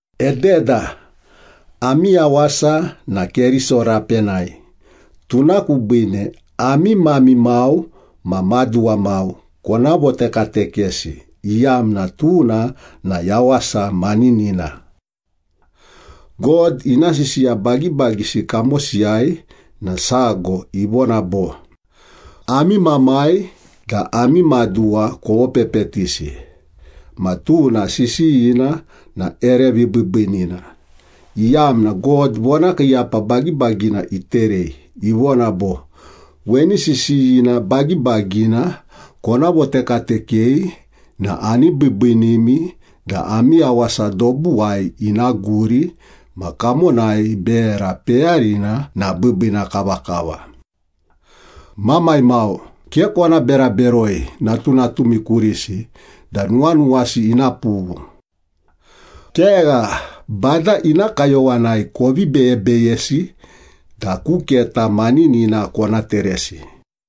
Ededa, ami yawasa na Keriso rapenai, tuna kubiine ami mami mau ma maduwa mau kona votekatekesi, iyamna tuna na yawasa maninina. God ina sisiya bagibagisi kamosiyai na sago ivona bo, “Ami mamai da ami maduwa kovopepetisi,” ma tuna sisiyina na ere vibiibiinina, iyamna God vonakiiyapa bagibagina iterei, ivona bo, “Weni sisiyina bagibagina kona votekatekei na ani biibiinimi da ami yawasa dobuwai ina guri ma kamonai bera peyarina na biibiina kavakava.” Mamai mau, ke kona bera beroi natunatumi kurisi da nuwanuwasi ina pughu. Kegha, Bada ina kayowanai kovi beyebeyesi da ku keta maninina kona teresi.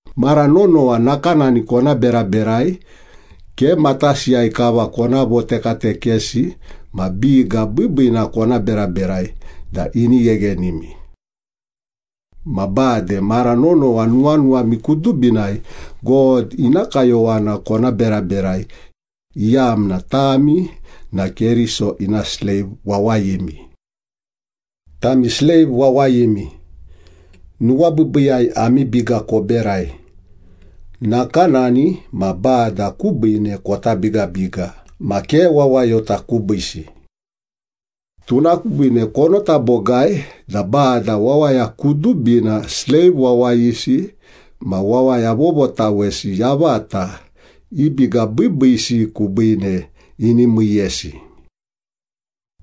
Mara nonowa nakanani kona beraberai, ke matasiyai kava kona votekatekesi ma biga biibiina kona beraberai da ini gheghenimi. Ma bade mara nonowa nuwanuwami kudubinai God ina kayowana kona beraberai, iyamna tami na Keriso ina sleiv wawayimi. Tami sleiv wawayimi, nuwabiibiiyai ami biga koberai, nakanani ma Bada kubiine kota bigabiga ma ke wawayota kubiisi. Tuna kubiine konota bogai da Bada wawaya kudubina, sleiv wawayisi ma wawaya vovotawesi yavata, i biga biibiisi kubiine ini miiyesi.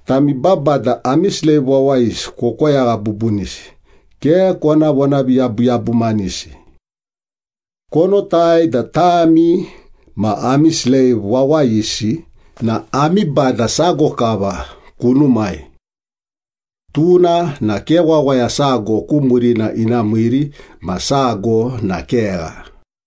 Tami babada, ami sleiv wawayisi kokoyagha bubunisi, ke kona vonaviyabuyabumanisi. Konotai da tami ma ami sleiv wawayisi na ami Bada sago kava kunumai. Tuna na ke wawaya sago ku murina ina miiri ma sago na kegha.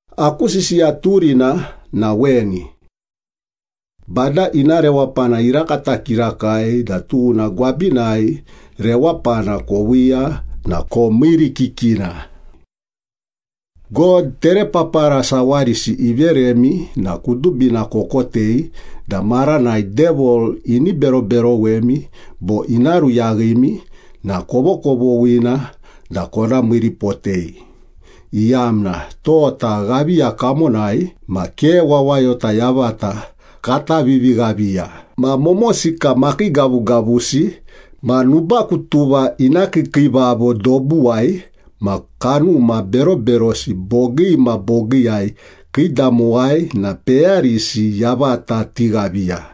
Aku sisiya turina na weni. Bada ina rewapana irakata kirakai da tuna gwabinai rewapana koviiya na komiirikikina. God terepapara sawarisi iveremi na kudubina kokotei da maranai Devil ini beroberowemi bo ina ruyaghimi na kovokovoghina da kona miiripotei, iyamna tota ghaviya kamonai ma ke wawayota yavata kata vivighaviya ma momosika makiigavugavusi, ma nubakutuva ina kiikiivavo dobuwai, ma kanuma beroberosi bogii ma bogiiyai kiidamowai na peyarisi yavata tighaviya.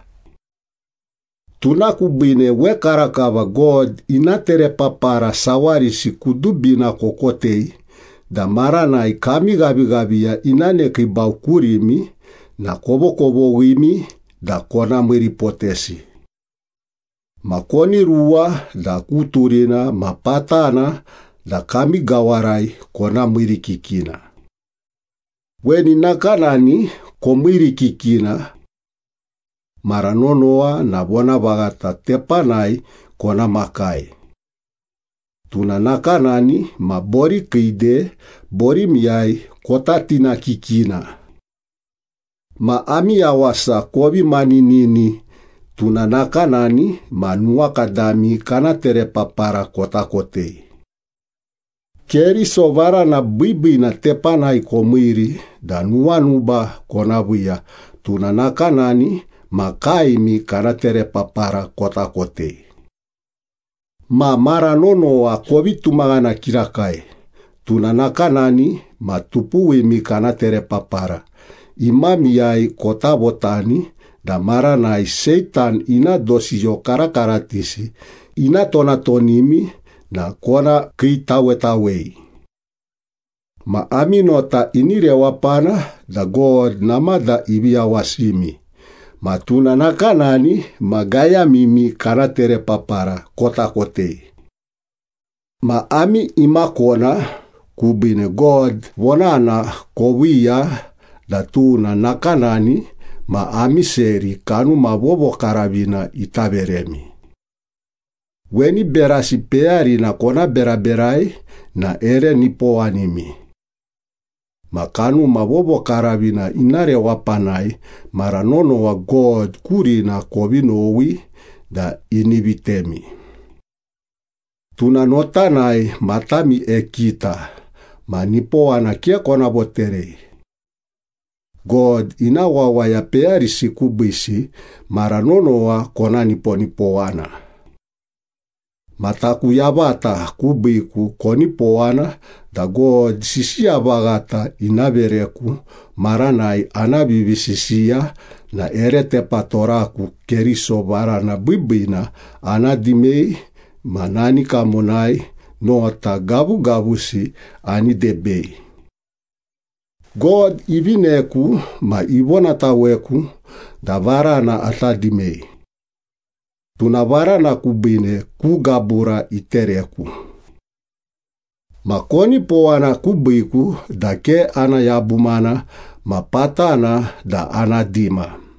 Tuna kubiine wekarakava God ina terepapara sawarisi kudubina kokotei da maranai kami ghavighaviya ina nekiibau kurimi na kovokovoghimi da kona miiripotesi. Ma koni ruwa da ku turina ma patana da kami gawarai kona miirikikina. Weni nakanani komiirikikina. Mara nonowa na vonavaghata tepanai kona makai. Tuna nakanani ma borikiide borimiyai kota tinakikina. Ma ami yawasa kovi maninini, tuna nakanani ma nuwakadami kana terepapara kota kotei. Keriso varana biibiina tepanai komiiri da nuwanuba kona viiya, tuna nakanani ma kaemi kana terepapara kota kotei. Ma mara nonowa kovi tumaghana kirakai, tuna nakanani ma tupuwimi kana terepapara imamiyai kota votani da maranai Seitan ina dosiyo karakaratisi ina tonatonimi na kona kiitawetawei. Ma ami nota ini rewapana da God namada ivi yawasimi ma tuna nakanani ma gayamimi kana terepapara kota kotei. Ma ami imakona kubiine God vonana koviiya da tuna nakanani ma ami seri Kanuma Vovokaravina ita veremi. Weni berasi peyarina kona beraberai na ere nipowanimi. Ma Kanuma Vovokaravina ina rewapanai mara nonowa God kurina kovi nowi da ini vitemi. Tuna notanai matami ekita ma nipowana ke kona voterei. God ina wawaya peyarisi kubiisi mara nonowa kona niponipowana. Ma taku yavata kubiiku konipowana da God sisiya vaghata ina vereku maranai ana vivisisiya na ere tepatoraku Keriso varana biibiina ana dimei ma nani kamonai nota gavugavusi ani debei. God ivineku ma ivonataweku da varana ata dimei. Tuna varana kubiine ku gabura itereku. Ma konipowana kubiiku da ke ana yabumana ma patana da ana dima.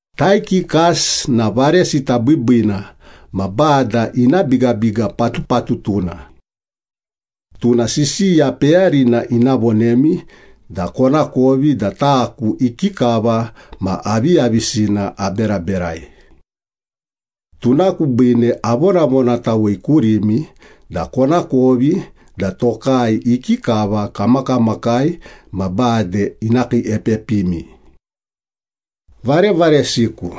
Taikikas na varesita biibiina ma Bada ina bigabiga patupatutuna. Tuna sisiya peyarina ina vonemi da konakovi da taku ikikava ma aviyavisina aberaberai. Tuna kubiine avonavonatawei kurimi da konakovi da tokai ikikava kamakamakai ma bade ina kiiepepimi. Varevaresiku,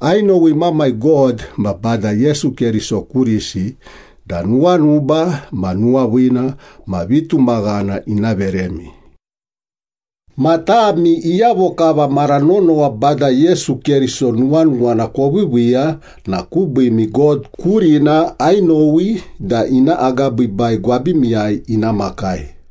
ainowi Mamai God ma Bada Yesu Keriso kurisi da nuwanuba ma nuwaviina ma vitumaghana ina veremi. Ma tami iyavo kava mara nonowa Bada Yesu Keriso nuwanuwana koviiviiya na kubiimi God kurina ainowi da ina agabiibai gwabimiyai ina makai.